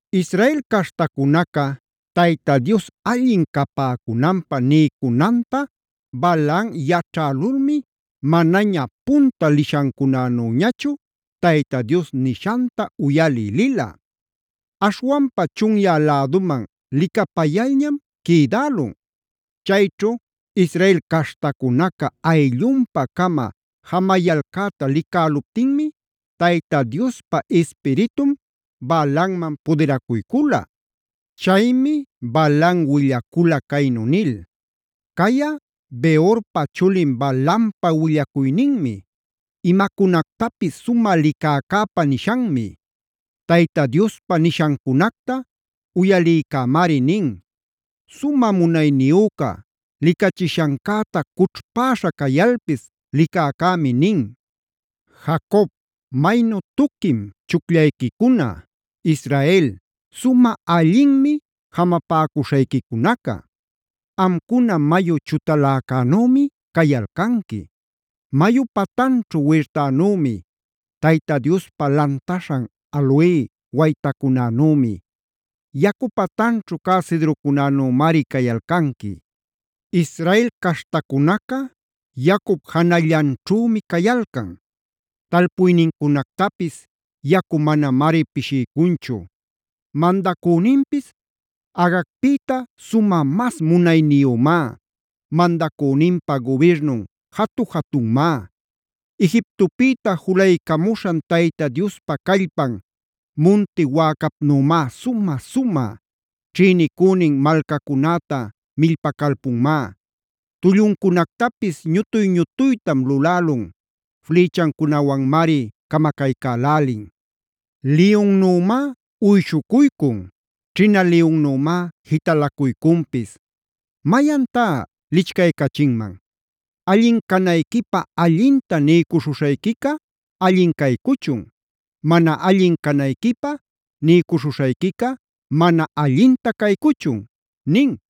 Israel caśhtacunaca Tayta Dios allin capäcunanpä niycunanta Balaam yaćhälulmi manaña punta lishancunanüñachu Tayta Dios nishanta uyalï lila. Aśhwanpa chunyä läduman licapayalñam quïdälun. Chayćhu Israel caśhtacunaca ayllunpa-cama jamayalcäta licäluptinmi Tayta Diospa Ispiritun Balaamman pudiracuycula. Chaymi Balaam willacula caynu nil: “Cayꞌa, Beorpa chulin Balaampa willacuyninmi; imacunactapis sumä licäcäpa nishanmi. Tayta Diospa nishancunacta uyalïcämari nin; sumä munayniyüca licachishancäta cućhpäśha cayalpis licäcämi nin. ¡Jacob, maynu tuquim chucllayquicuna! ¡Israel, sumä allinmi jamapäcuśhayquicunaca! Amcuna mayu chutaläcänümi cayalcanqui; mayu patanćhu wirtanümi, Tayta Diospa lantaśhan aloe waytacunänümi, yacu patanćhu cä cedrocunänümari cayalcanqui. Israel caśhtacunaca yacup janallanćhümi cayalcan; talpuynincunactapis yacu manamari pishiycunchu. Mandacüninpis Agagpïta sumä mas munayniyümá; mandacüninpa gubirnun jatu-jatunmá. Egiptopïta julaycamuśhan Tayta Diospa callpan munti wäcapnümá sumä-sumä. Ćhïnicünin malcacunäta millpacalpunmá; tulluncunactapis ñutuy-ñutuytam lulälun. Flïchancunawanmari camacaycälälin. Liyunnümá uyshucuycun; ćhina liyunnümá jitalacuycunpis. ¿Mayantá lichcaycachinman?a ¡Allin canayquipä allinta niycuśhuśhayquica allin caycuchun! ¡Mana allin canayquipä niycuśhuśhayquica mana allintac caycuchun!”b nin.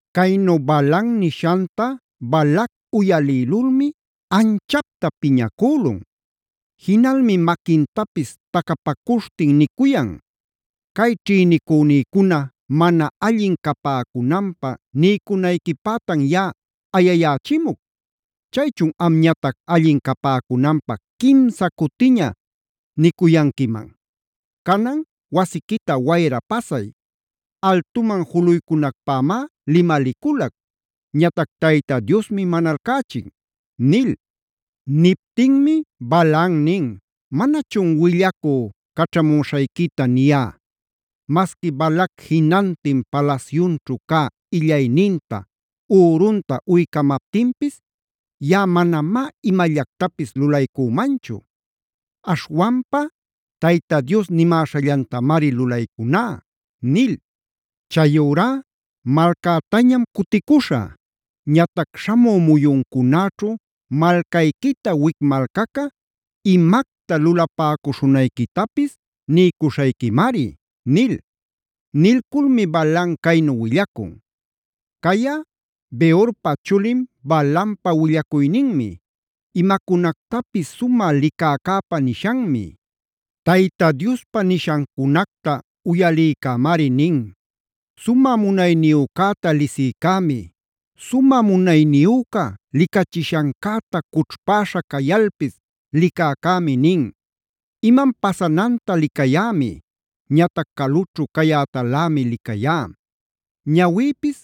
Caynu Balaam nishanta Balac uyalïlulmi anchapta piñacülun. Jinalmi maquintapis tacapacuśhtin nicuyan: “¡Cay ćhïnicünïcuna mana allin capäcunanpä niycunayquipätan yaꞌa ayayächimuc! ¡Chaychun amñatac allin capäcunanpä quimsa cutiña niycuyanquiman! ¡Canan, wasiquita wayra pasay! Altuman juluycunacpämá limaliculac; ñatac Tayta Diosmi manalcächin” nil. Niptinmi Balaam nin: “Manachun willacü caćhamuśhayquita niyá: ‘Masqui Balac jinantin palasyunćhu cä illayninta, ürunta uycamaptinpis yaꞌa manamá imallactapis lulaycümanchu. Aśhwanpa Tayta Diospa nimäśhallantamari lulaycuná’ nil. Chayurá malcätañam cuticuśhä. Ñatac śhamü muyuncunäćhu malcayquita wic malcaca imacta lulapäcuśhunayquitapis niycuśhayquimari” nil. Nilculmi Balaam caynu willacun: “Cayꞌa, Beorpa chulin Balaampa willacuyninmi; imacunactapis sumä licäcäpa nishanmi. Tayta Diospa nishancunacta uyalïcämari nin; sumä munayniyücäta lisïcämi, sumä munayniyüca licachishancäta cućhpäśha cayalpis licäcämi nin. Imam pasananta licayämi, ñatac calućhu cayätalämi licayá. Ñawïpis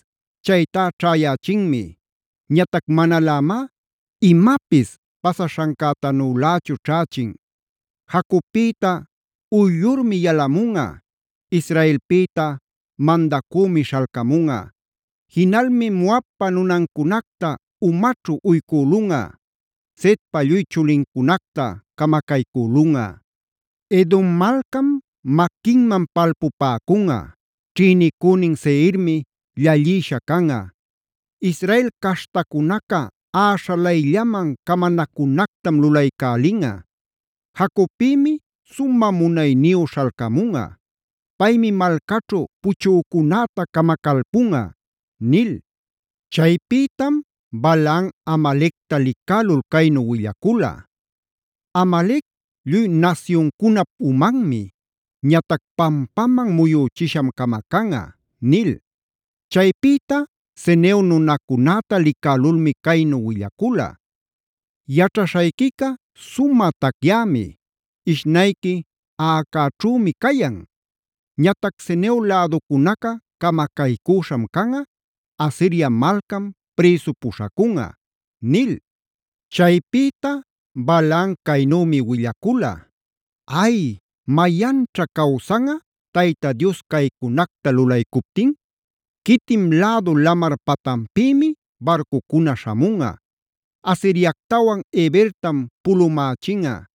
ćhaytá ćhäyächinmi; ñatac manalämá imapis pasaśhancätanülächu ćhächin. Jacobpïta uyllurmi yalamunꞌa; Israelpïta mandacümic śhalcamunꞌa. Jinalmi Moabpa nunancunacta umaćhu uycülunꞌa; Setpa lluy chulincunacta camacaycülunꞌa. Edom malcam maquinman palpupäcunꞌa; ćhïnicünin Seirmi llallïsha canꞌa. Israel caśhtacunaca äśhalayllaman camanacunactam lulaycälinꞌa. Jacobpïmi sumä munayniyü śhalcamunꞌa; paymi malcaćhu puchücunäta camacalpunꞌa” nil. Chaypïtam Balaam Amalecta licälul caynu willacula: “Amalec lluy nasyuncunap umanmi; ñatac pampaman muyüchisham camacanꞌa” nil. Chaypïta Ceneo nunacunäta licälulmi caynu willacula: “Yaćhaśhayquica sumä tacyämi, ishnayqui aꞌacäćhümi cayan. Ñatac Ceneo läducunaca camacaycüśham canꞌa, Asiria malcam prïsu puśhacunꞌa” nil. Chaypïta Balaam caynümi willacula: “¡Ay! ¿Mayanćha cawsanꞌa Tayta Dios caycunacta lulaycuptin? Quitim lädu lamar patanpïmi barcucuna śhamunꞌa. Asiriactawan Hebertam pulumächinꞌa;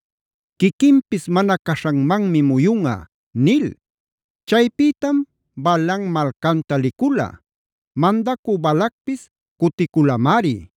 quiquinpis mana caśhanmanmi muyunꞌa” nil. Chaypïtam Balaam malcanta licula. Mandacü Balacpis cuticulamari.